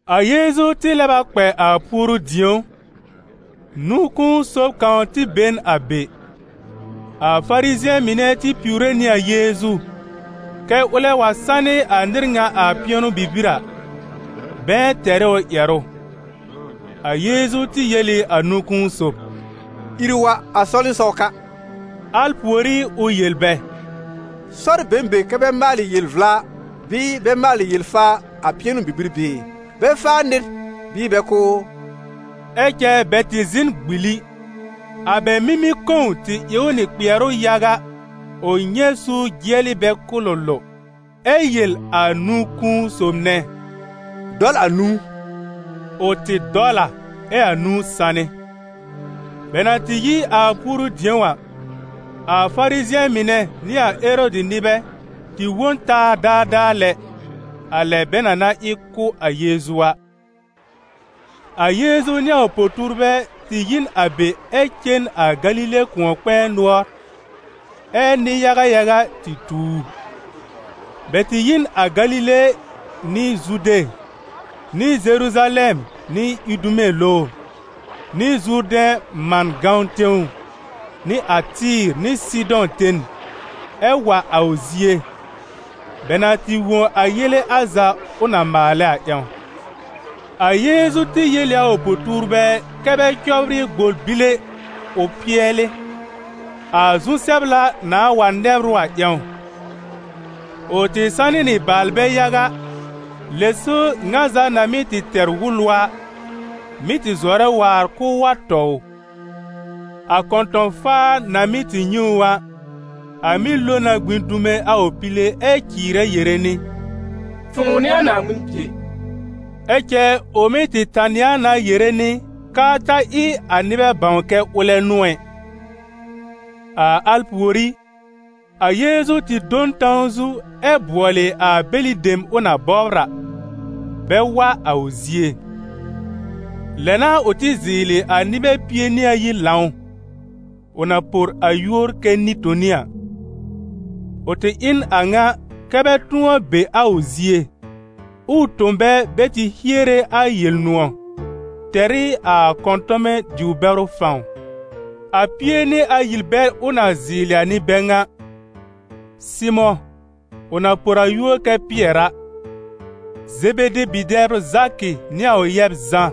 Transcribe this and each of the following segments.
A Yeezu tɩ lɛb a kpɛ a puoru-dĩ̀ó. Nũ-kũu sob kãw tɩ be n a be. A Farizɩ̃ɛ mɩnɛ tɩ piwre nɩ a Yeezu, kɛ́ ʋlɛ wa sanɩ a nɩr ŋa a pɩɛnʋ-bibir a, bɛ̃ɛ tɛr ɩ ʋ ƴɛrʋ. A Yeezu tɩ yel ɩ a nũ-kũu sob: «Ìr wa a sɔwlɩsɔw ka.» Al pùorí ʋ yel bɛ: «Sɔr be n be kɛ bɛ maalɩ yel-vla bɩɩ bɛ maalɩ yel-faa a pɩɛnʋ-bibir bɩɩ? Bɛ́ faa nɩr bɩɩ bɛ kʋ́ ʋ?» Ɛ cɛ bɛ tɩ zɩ̃ n gbili. A bɛ mimi-kõw tɩ ɩ ʋ nɩ kpɩɛrʋ yaga, ʋ nyɛ̃ suur jɩɛlɩ bɛ kʋlʋlʋ, ɛ yel a nũ-kũu sob nɛ: «Dɔl a nũu.» Ʋ tɩ dɔl a, ɛ a nũu sanɩ. Bɛ na tɩ yi a puoru-dĩ̀ó a, a Farizɩ̃ɛ mɩnɛ nɩ a Erɔdɩ nɩbɛ tɩ wõ n taa daadaa lɛ, a lɛ bɛ na na ɩ kʋ́ a Yeezu a. A Yeezu nɩ a ʋ po-tuurbɛ tɩ yi n a be ɛ cen a Galile kʋ̃ɔ-kpɛ̃ɛ nʋɔr, ɛ́ nɩ-yaga yaga tɩ tu ʋ. Bɛ tɩ yi n a Galile nɩ Zude, nɩ Zeruzalɛm nɩ Idume lowr, nɩ Zurdɛ̃ man gãwn tẽw, nɩ a Tɩ́ɩ̀r nɩ Sɩdɔ̃ ten, ɛ wa a ʋ zie, bɛ na tɩ wõ a yele al za ʋ na maalɛ a ƴãw. A Yeezu tɩ yel ɩ a ʋ po-tuurbɛ kɛ́ bɛ cɔbrɩ gbor bile ʋ pɩɛlɩ, a zu-sɛbla nãá wa nɛbr ʋ a ƴãw. Ʋ tɩ sanɩ nɩ baalbɛ yaga, lɛ so ŋa za na mɩ́ tɩ tɛr wʋlʋ a, mɩ́ tɩ zɔrɛ waar k'ʋʋ wa tɔ ʋ. A kɔ̃tɔ̃-faar na mɩ́ tɩ nyɛ̃ ʋ a, a mɩ́ lo na gbĩ dume a ʋ pile ɛ cɩɩrɛ yere nɩ: «Fʋ̃ʋ n'ɩ a Naaŋmɩn Bie.» Ɛ cɛ ʋ mɩ́ tɩ tanɩ a na yere nɩ k'aa ta ɩ a nɩbɛ bãw kɛ ʋlɛ n'ʋ ɛ. A al pùorí, a Yeezu tɩ do n tãw zu ɛ bʋɔlɩ a bɛlɩ dem ʋ na bɔbr a, bɛ wa a ʋ zie. Lɛ n'a ʋ tɩ zɩɩlɩ a nɩbɛ pie nɩ ayi lãw, ʋ na por a yúor kɛ Nɩ-toni a. Ʋ tɩ ɩ n a ŋa kɛ́ bɛ tʋ̃ɔ be a ʋ zie, ʋʋ tõ bɛ bɛ tɩ hiere a Yel-nʋ̃ɔ̀, tɛr ɩ a kɔ̃tɔmɛ diw-bɛrʋ fãw. A Pie-nɩ-ayi bɛl ʋ na zɩɩlɩ a n'ɩ bɛ ŋa: Sɩmʋ̃, ʋ na por a yúor kɛ Pɩɛr a, Zebede bi-dɛbr Zakɩ nɩ a ʋ yɛb Zã,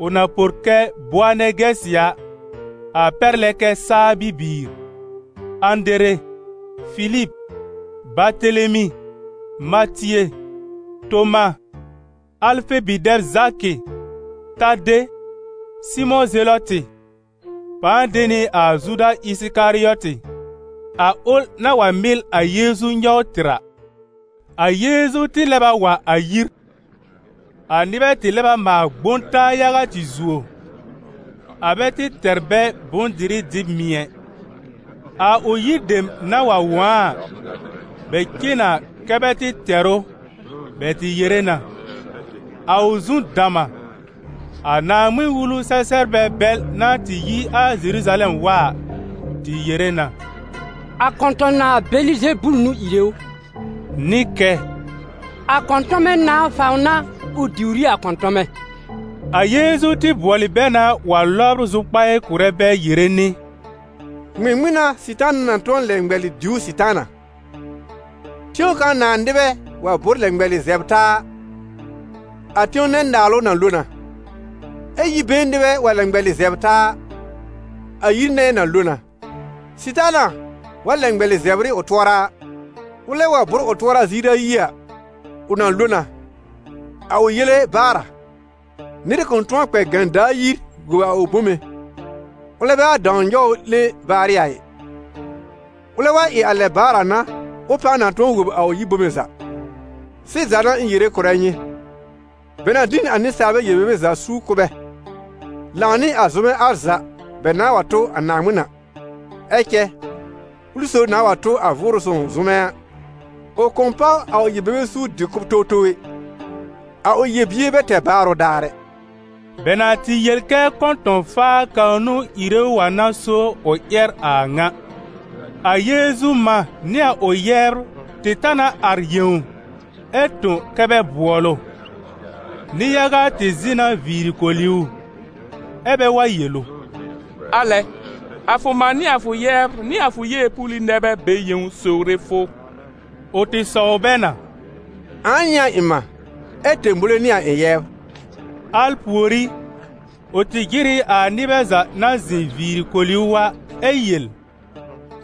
ʋ na por kɛ «Boanɛgɛsɩ» a, a pɛr lɛ kɛ saa bibiir, Ãdere, Filib, Batelemi, Matie, Toma, Alfe bi-dɛb Zakɩ, Tade, Sɩmʋ̃ Zelɔtɩ, pãa de nɩ a Zuda Ɩsɩkarɩɔtɩ, a ʋl na wa mɩl a Yeezu nyɔw tɩr a. A Yeezu tɩ lɛb a wa a yir. A nɩbɛ tɩ lɛb a maal gbõ taa yaga tɩ zuo, a bɛ tɩ tɛr bɛ bʋ̃-dɩrɩ dɩb mɩ̀ ɛ. A ʋ yir dem na wa wõ a a, bɛ cen na kɛ bɛ tɩ tɛr ʋ, bɛ tɩ yere na: «A ʋ zu dam a!» A Naaŋmɩn-Wulu-sɛ-sɛbrbɛ bɛl na tɩ yi a Zeruzalɛm wa a, tɩ yere na: «A kɔ̃tɔ̃-nãà Bɛlɩzebul n'ʋ ìre ʋ!» Nɩ kɛ: «A kɔ̃tɔmɛ nãà fãw n'a ʋ diwr ɩ a kɔ̃tɔmɛ.» A Yeezu tɩ bʋɔlɩ bɛ na wa lɔbr zʋkpaɩ kʋ̀rɛ bɛ yere nɩ: «Ŋmɩŋmɩn n'a Sɩtaana na tʋ̃ɔ lɛ ŋmɛlɩ diwr Sɩtaana? Tẽw kãw nãà nɩbɛ wa bʋ́r lɛ ŋmɛlɩ zɛbr taa a, a tẽw nɛ naalʋ na lo na. Ɛ yi-been nɩbɛ wa lɛ ŋmɛlɩ zɛbr taa a, a yir nɛ na lo na. Sɩtaana wa lɛ ŋmɛlɩ zɛbr ɩ ʋ tʋɔra a, ʋlɛ wa bʋ́r ʋ tʋɔra ziir ayi a, ʋ na lo na, a ʋ yele baar a. Nɩr kʋ̃ tʋ̃ɔ kpɛ gãdaa yir wob a ʋ bome, ʋlɛ bɛ wa dãw nyɔw ʋ 'lẽ baarɩ a ɩ; ʋlɛ wa ɩ a lɛ baar a n'a, ʋ pãa na tʋ̃ɔ wob a ʋ yir bome za. Sɩza n'a ɩ̃ yere kʋ̀rɛ nyɩ, bɛ na dɩ n a nɩsaalbɛ yel-bebe za suur kʋ̀ bɛ, lãw nɩ a zʋmɛ al za bɛ nãà wa tʋ a Naaŋmɩn a. Ɛ cɛ, ʋlɩ sob nãà wa tʋ a Vʋʋrʋ Sõw zʋmɛ a, ʋ kʋ̃ páw a ʋ yel-bebe suur dɩ-kʋ̀b towtow ɛ, a ʋ yel-bier bɛ tɛr baarʋ daar ɛ.» Bɛ na tɩ yel kɛ kɔ̃tɔ̃-faa kãw n'ʋ ìre ʋ a n'a so ʋ ƴɛr a a ŋa. A Yeezu mã nɩ a ʋ yɛbr tɩ ta na ar yẽw, ɛ tõ kɛ́ bɛ bʋɔl ʋ. Nɩ-yaga tɩ zɩ̃ na viiri koli ʋ, ɛ́ bɛ wa yel ʋ: «Alɛ! A fʋ mã nɩ a fʋ yɛbr nɩ a fʋ yeepuuli nɛ bɛ be yẽw sowre fʋ.» Ʋ tɩ sɔw bɛ na: «Ãa n'ɩ a ɩ̃ mã, ɛ tẽbowle n'ɩ a ɩ̃ yɛbr?» Al pùorí, ʋ tɩ jɩr ɩ a nɩbɛ za na zɩ̃ viiri koli ʋ a, ɛ yel: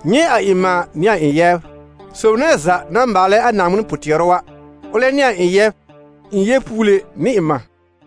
«Nyɛ̃ a ɩ̃ mã nɩ a ɩ̃ yɛbr. Sob nɛ za na maalɛ a Naaŋmɩn pʋ-tɩɛrʋ a, ʋlɛ n'ɩ a ɩ̃ yɛb, ɩ̃ yeepuule nɩ ɩ̃ mã.»